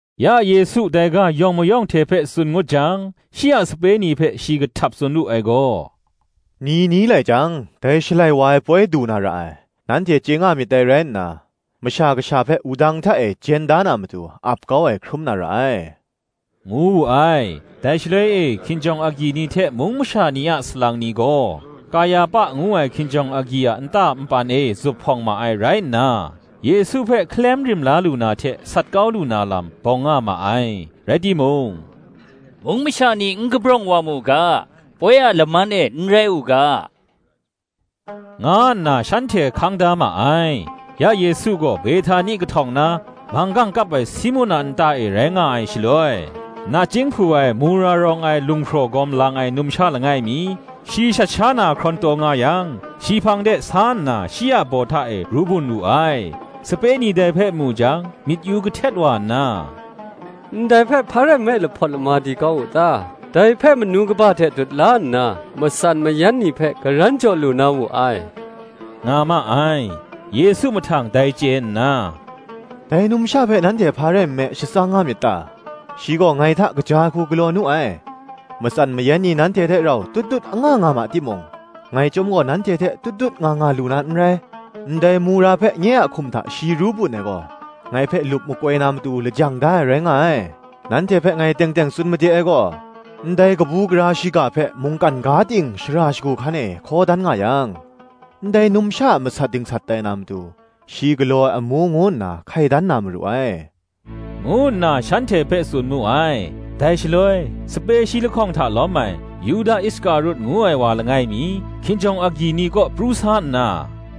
Ya Yesu dai ga yawng mayawng hte hpe tsun ngut jang, shi a sape ni hpe shi kahtap tsun wu ai gaw, “Ni ni lai jang dai Shalai wa ai poi du na ra ai, nanhte chye nga myit dai rai nna, Masha Kasha hpe wudang hta e jen da na matu, ap kau ai hkrum na ra ai,” ngu wu ai. Dai shaloi e hkinjawng agyi ni hte mung masha ni a salang ni gaw, Kayahpa ngu ai hkinjawng agyi a nta npan e zuphpawng ma ai rai nna, Yesu hpe hkalem rim la lu na hte sat kau lu na lam, bawng nga ma ai: rai timung, Mung masha ni n kabrawng wa mu ga, poi a laman e n rai u ga, nga nna shanhte hkang da ma ai. Ya Yesu gaw Behtani kahtawng na, manggang kap ai Simun a nta e rai nga ai shaloi, nachying hpu ai mura rawng ai lunghpraw gawm lang ai numsha langai mi, shi shat sha na hkrawn taw nga yang, shi hpang de sa nna shi a baw hta e ru bun wu ai. Sape ni dai hpe mu jang, myit yu kahtet wa nna, “Ndai hpe hpa rai nme lahpawt lama di kau wu ta? Dai hpe manu kaba hte dut la nna, matsan mayan ni hpe karan jaw lu na wu ai,” nga ma ai. Yesu mahtang dai chye nna, “Dai numsha hpe nanhte hpa rai nme shatsang nga myit ta? Shi gaw, ngai hta kaja ai hku galaw nu ai: matsan mayang ni nanhte hte rau tut tut anga nga ma timung, ngai chyawm gaw nanhte hte tut tut nga nga lu na n rai. Ndai mura hpe nye a hkum hta shi ru bun ai gaw, ngai hpe lup makoi na matu lajang da ai rai nga ai. Nanhte hpe ngai teng teng tsun made ai gaw, Ndai kabu gara shiga hpe mungkan ga ting shara shagu hkan e hkaw dan nga yang, ndai numsha a masat dingsat tai na matu, shi galaw ai amu ngu nna hkai dan na maru ai,” ngu nna shanhte hpe tsun mu ai. Dai shaloi, sape shi lahkawng hta lawm ai, Yuda Iskarut ngu ai wa langai mi, hkinjawng agyi ni kaw pru sa nna,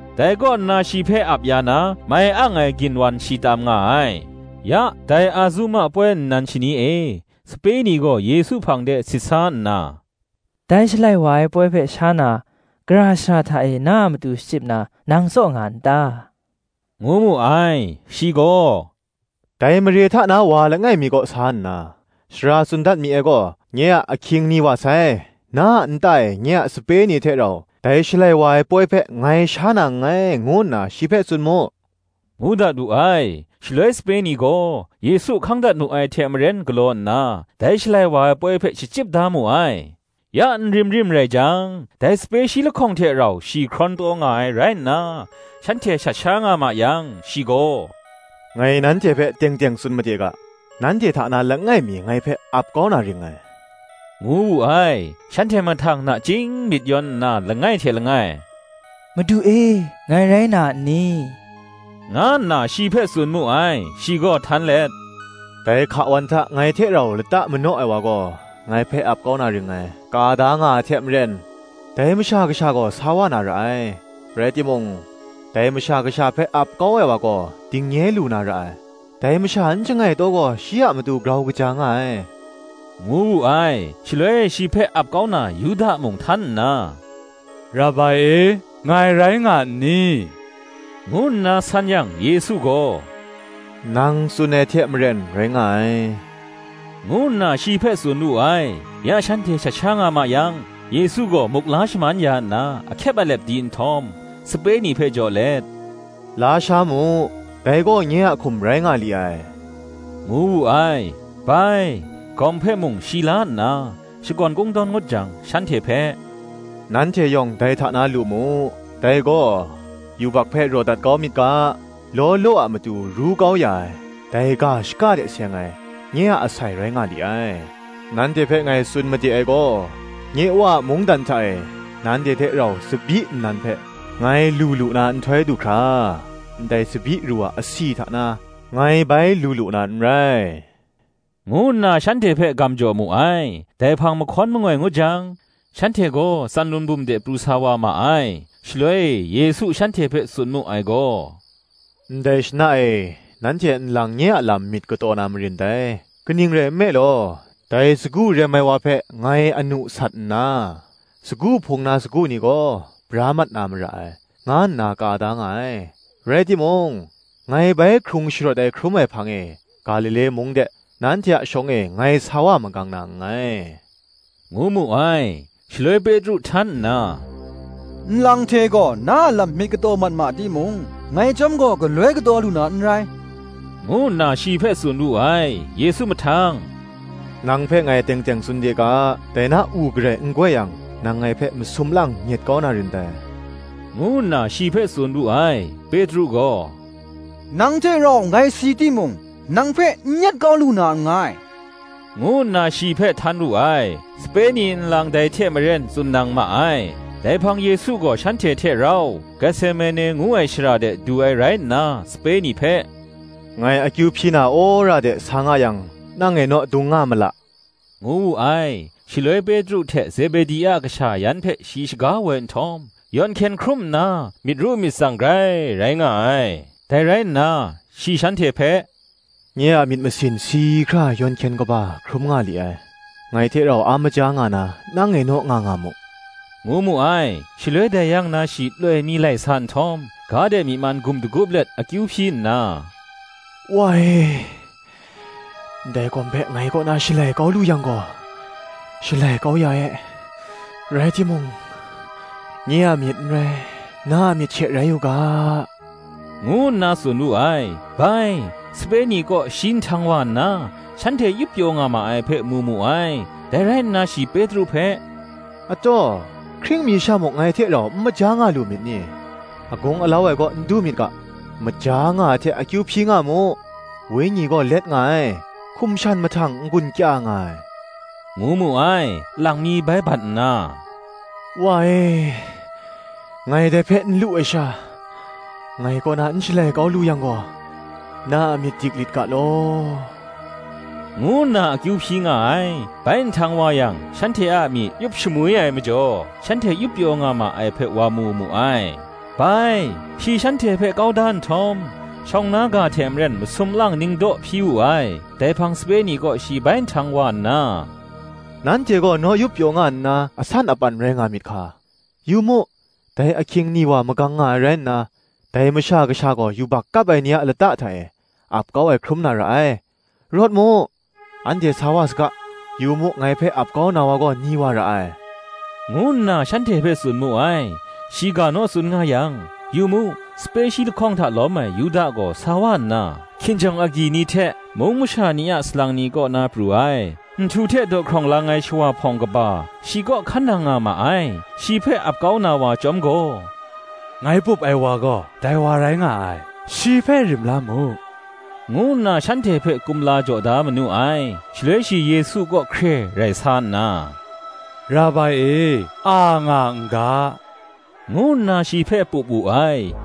Dai kaw nna shi hpe ap ya na mai ang ai ginwan shi tam nga ai. Ya dai Azuma poi nnan shani e, sape ni gaw Yesu hpang de sit sa nna, Dai Shalai wa ai poi hpe sha na, gara shara hta e na a matu shachyip na, nang tsaw nga n ta? ngu mu ai. Shi gaw, Dai mare hta na masha langai mi kaw sa nna, “Sara tsun dat mi ai gaw, Nye a ahkying ni wa sai: na a nta e nye a sape ni hte rau, dai Shalai wa ai poi hpe ngai sha na nngai, ngu nna shi hpe tsun mu,” ngu dat wu ai. Shaloi sape ni gaw, Yesu hkang dat mu ai hte maren galaw nna, dai Shalai wa ai poi hpe shachyip da mu ai. Ya nrim rim rai jang, dai sape shi lahkawng hte rau shi hkrawn taw nga ai rai nna, shanhte shat sha nga ma yang shi gaw, “Ngai nanhte hpe teng teng tsun made ga, Nanhte hta na langai mi ngai hpe ap kau na ring ngai,” ngu wu ai. Shanhte mahtang nachying myit yawn nna, langai hte langai, “Madu e, ngai rai na n ni?” nga nna shi hpe tsun mu ai. Shi gaw htan let, “Dai hka wan hta ngai hte rau lata manaw ai wa gaw, ngai hpe ap kau na ring ngai: ka da nga ai hte maren, dai Masha Kasha gaw sa wa na ra ai; rai timung, dai Masha Kasha hpe ap kau ai wa gaw dingnye lu na ra ai! dai masha n shangai taw gaw, shi a matu grau kaja nga ai, ngu wu ai. Shaloi shi hpe ap kau na Yuda mung htan nna, “Rabai e, ngai rai nga n ni?” ngu nna san yang, Yesu gaw, Nang tsun ai hte maren rai nga ai, ngu nna shi hpe tsun wu ai. Ya shanhte shat sha nga ma yang, Yesu gaw muk la shaman ya nna ahkyep alep di nhtawm, sape ni hpe jaw let, “La sha mu; dai gaw nye a hkum rai nga li ai,” ngu wu ai. Bai, gawm hpe mung shi la nna, shakawn kungdawn ngut jang shanhte hpe, “Nanhte yawng dai hta na lu mu; dai gaw, yubak hpe raw dat kau myit ga, law law a matu ru kau ya ai, dai ga shaka hte seng ai, nye a asai rai nga li ai: nanhte hpe ngai tsun made ai gaw, “Nye Wa a mungdan hta e, nanhte hte rau tsabyi nnan hpe ngai lu lu na nhtoi du hkra, ndai tsabyi ru a asi hta na ngai bai lu lu na n rai,” ngu nna shanhte hpe gam jaw mu ai. Dai hpang mahkawn mangoi ngut jang, shanhte gaw Tsanlun bum de pru sa wa ma ai. Shaloi e Yesu shanhte hpe tsun mu ai gaw, Ndai shana e, nanhte nlang nye a lam myit kataw na marin dai; kaning rai nme law, ‘sagu rem ai wa hpe ngai anu sat nna, sagu hpung na sagu ni gaw, bra mat na mara ai, nga nna ka da nga ai: rai timung, ngai bai hkrung sharawt ai hkrum ai hpang e, Galile mung de, nanhte a shawng e ngai sa wa magang na nngai,” ngu mu ai. Shaloi Petru htan nna, Nlang hte gaw na a lam myit kataw mat ma timung, ngai chyawm gaw galoi kataw lu na n rai, ngu nna shi hpe tsun wu ai. Yesu mahtang, “Nang hpe ngai teng teng tsun de ga, dai na u garai n goi yang, nang ngai hpe masum lang nyet kau na rin dai, ngu nna shi hpe tsun wu ai. Petru gaw, “Nang hte rau ngai si timung, nang hpe n nyet kau lu na nngai,” ngu nna shi hpe htan wu ai. Sape ni nlang dai hte maren tsun nang ma ai. Dai hpang Yesu gaw shanhte hte rau, Getsemane ngu ai shara de du ai rai nna, sape ni hpe, Ngai akyu hpyi na wora de sa nga yang, nang e naw dung nga ma la, ngu wu ai. Shaloi Petru hte Zebedi a kasha yan hpe shi shaga woi nhtawm, yawn hkyen hkrum nna, myit ru myit tsang grai rai nga ai. Dai rai nna, shi shanhte hpe, Nye a myit masin si hkra yawn hkyen kaba hkrum nga li ai: ngai hte rau a maja nga na nang e naw nga nga mu, ngu mu ai. Shaloi dai yang na shi loi mi lai sa nhtawm, ga de myi man gum dagup let akyu hpyi nna, “Wa e, ndai gawm hpe ngai kaw na shalai kau lu yang gaw, shalai kau ya e; rai timung, nye a myit n rai, na a myit she rai u ga,” ngu nna tsun wu ai. Bai, sape ni kaw shi nhtang wa nna, shanhte yup pyaw nga ma ai hpe mu mu ai; dai rai nna shi Petru hpe, “hkying mi sha muk ngai hte rau n maja nga lu myit ni? agung alau ai kaw n du myit ga, maja nga ai hte akyu hpyi nga mu: wenyi gaw let nga ai, hkum shan mahtang n-gun kya nga ai,” ngu mu ai. Lang mi bai bat nna, “Wa e ngai dai hpe n lu ai sha, ngai kaw na n shalai kau lu yang gaw, na a myit dik lit ga law,” ngu nna akyu hpyi nga ai. Bai nhtang wa yang shanhte a myi yup shamwi ai majaw, shanhte yup pyaw nga ma ai hpe wa mu mu ai. Bai shi shanhte hpe kau da nhtawm, shawng na ga hte maren masum lang ningdaw hpyi wu ai. Dai hpang sape ni kaw shi bai nhtang wa nna, “Nanhte gaw naw yup pyaw nga nna asan apan rai nga myit hka! yu mu, dai ahkying ni wa magang nga ai rai nna, dai Masha Kasha gaw yubak kap ai ni a lata hta e, ap kau ai hkrum na ra ai. Rawt mu, anhte sa wa saga: yu mu, ngai hpe ap kau na wa gaw ni wa ra ai,” ngu nna shanhte hpe tsun mu ai. Shi ga naw tsun nga yang, yu mu, sape shi lahkawng hta lawm ai Yuda gaw sa wa nna, hkinjawng agyi ni hte, mung masha ni a salang ni kaw na pru ai, nhtu hte dawhkrawng lang ai shawa hpawng kaba, shi gaw hkan nang nga ma ai. Shi hpe ap kau na wa chyawm gaw, “Ngai pup ai wa gaw, dai wa rai nga ai: shi hpe rim la mu, ngu nna shanhte hpe kumla jaw da manu ai: Shaloi shi Yesu kaw hkre rai sa nna, Rabai e, a nga n ga,” ngu nna shi hpe pup wu ai.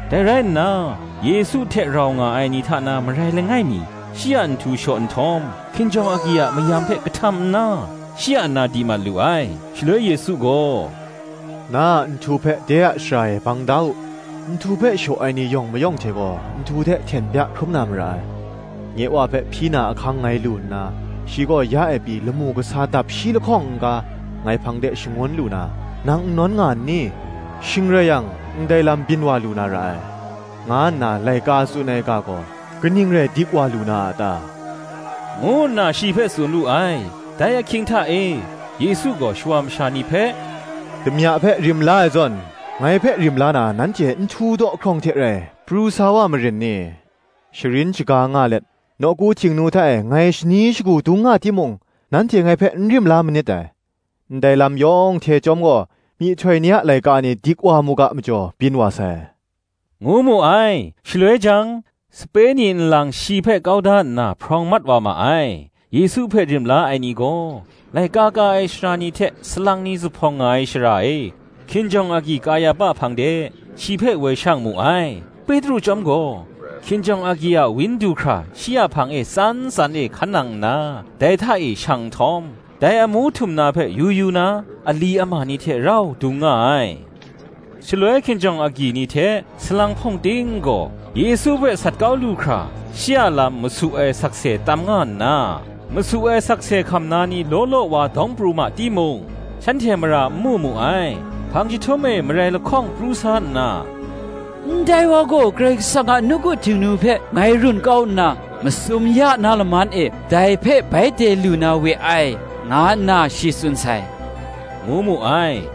Dai rai nna, Yesu hte rau nga ai ni hta na marai langai mi shi a nhtu shaw nhtawm, hkinjawng agyi a mayam hpe kahtam nna, shi a na di mat lu ai. Shaloi Yesu gaw, “Na a nhtu hpe de a shara e bang da u; nhtu hpe shaw ai ni yawng mayawng hte gaw, nhtu hte hten bya hkrum na mara ai: nye Wa hpe hpyi na ahkang ngai lu nna, shi gaw ya e pyi lamu kasa dap shi lahkawng n-ga, ngai hpang de shangun lu na, nang n nawn nga n ni? Shing rai yang, ndai lam byin wa lu na ra ai, nga nna laika tsun ai ga gaw, kaning rai dik wa lu na a ta?” ngu nna shi hpe tsun wu ai. Dai ahkying hta e, Yesu gaw shawa masha ni hpe, “Damya hpe rim la ai zawn, ngai hpe rim la na, nanhte nhtu dawhkrawng hte rai pru sa wa marin ni? Sharin shaga nga let nawku Htingnu hta e, ngai shani shagu dung nga timung, nanhte ngai hpe n rim la manit dai: ndai lam yawng hte chyawm gaw, myihtoi ni a laika ni dik wa mu ga majaw byin wa sai,” ngu mu ai. Shaloi jang, sape ni nlang shi hpe kau da nna hprawng mat wa ma ai. Yesu hpe rim la ai ni gaw, laika ka ai sara ni hte salang ni zuphpawng nga ai shara e, hkinjawng agyi Kayahpa hpang de, shi hpe woi shang mu ai. Petru chyawm gaw, hkinjawng agyi a wang du hkra shi a hpang e tsan tsan e hkan nang nna, dai hta e shang nhtawm, dai amu htum na hpe yu yu na, ali ama ni hte rau dung nga ai. Shaloi hkinjawng agyi ni hte, salang hpawng ting gaw, Yesu hpe sat kau lu hkra, shi a lam masu ai sakse tam nga nna, masu ai sakse hkam na ni law law wa dawng pru ma timung, shanhte mara n mu mu ai. Hpang jahtum e marai lahkawng pru sa nna, “Ndai wa gaw, Karai Kasang a nawku Htingnu hpe ngai run kau nna, masum ya na laman e dai hpe bai de lu na we ai, nga nna shi tsun sai,” ngu mu ai.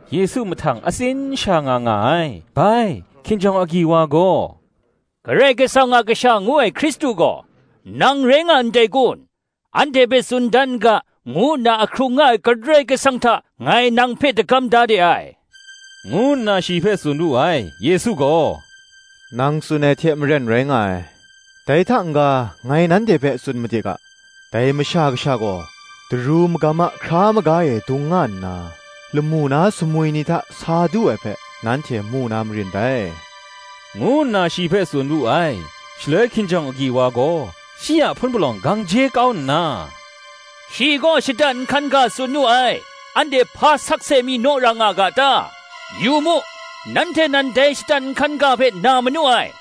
Yesu mahtang atsin sha nga nga ai. Bai, hkinjawng agyi wa gaw, “Karai Kasang a Kasha, ngu ai Hkristu gaw, nang rai nga ndai kun, anhte hpe tsun dan n ga, ngu nna ahkrung nga ai Karai Kasang hta ngai nang hpe dagam da de ai,” ngu nna shi hpe tsun wu ai. Yesu gaw, “Nang tsun ai hte maren rai nga ai: dai hta n-ga ngai nanhte hpe tsun made ga, Dai Masha Kasha gaw, Daru Magam a hkra maga e dung nga nna lamu na sumwi ni hta sa du ai hpe nanhte mu na marin dai,” ngu nna shi hpe tsun wu ai. Shaloi hkinjawng agyi wa gaw, shi a hpun palawng gang je kau nna, “Shi gaw shatan nhkan ga tsun nu ai anhte hpa sakse mi naw ra nga ga ta? yu mu, nanhte nan dai shatan nhkan ga hpe na manu ai: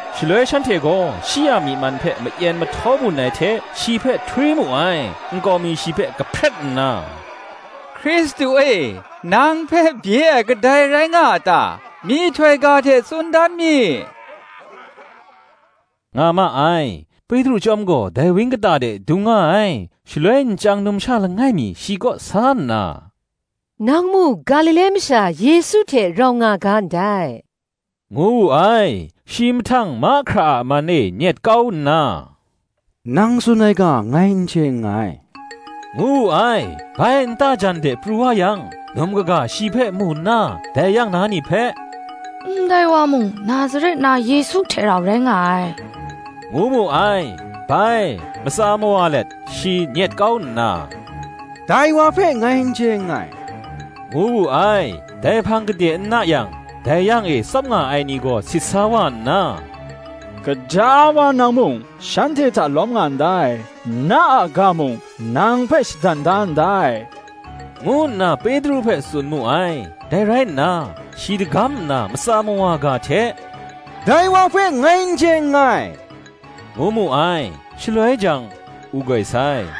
Shaloi shanhte gaw shi a myi man hpe mayen mahtaw bun ai hte shi hpe htwi mu ai: nkau mi shi hpe kahpret nna, “Hkristu e nang hpe bye ai kadai rai nga a ta? myihtoi ga hte tsun dan mi,” nga ma ai. Petru chyawm gaw dai wang kata de dung nga ai: shaloi nchyang numsha langai mi shi kaw sa nna, “Nang mung Galile masha Yesu hte rau nga ga ndai,” ngu wu ai. Shi mahtang mahkra a man e nyet kau nna, “Nang tsun ai ga ngai n chye nngai,” ngu wu ai. Bai nta jan de pru wa yang, num kaga shi hpe mu nna, dai yang na ni hpe, “Ndai wa mung Nazaret na Yesu hte rau rai nga ai,” ngu mu ai. Bai, matsa mawa let, shi nyet kau nna, “Dai wa hpe ngai n chye nngai,” ngu wu ai. Dai hpang gade n na yang, dai yang e tsap nga ai ni gaw sit sa wa nna, “Gaja wa nang mung, shanhte hta lawm nga ndai: na a ga mung nang hpe shadan da ndai,” ngu nna Petru hpe tsun mu ai. Dai rai nna, shi dagam nna matsa mawa ga hte, “Dai wa hpe ngai n chye nngai,” ngu mu ai: shaloi jang, u goi sai.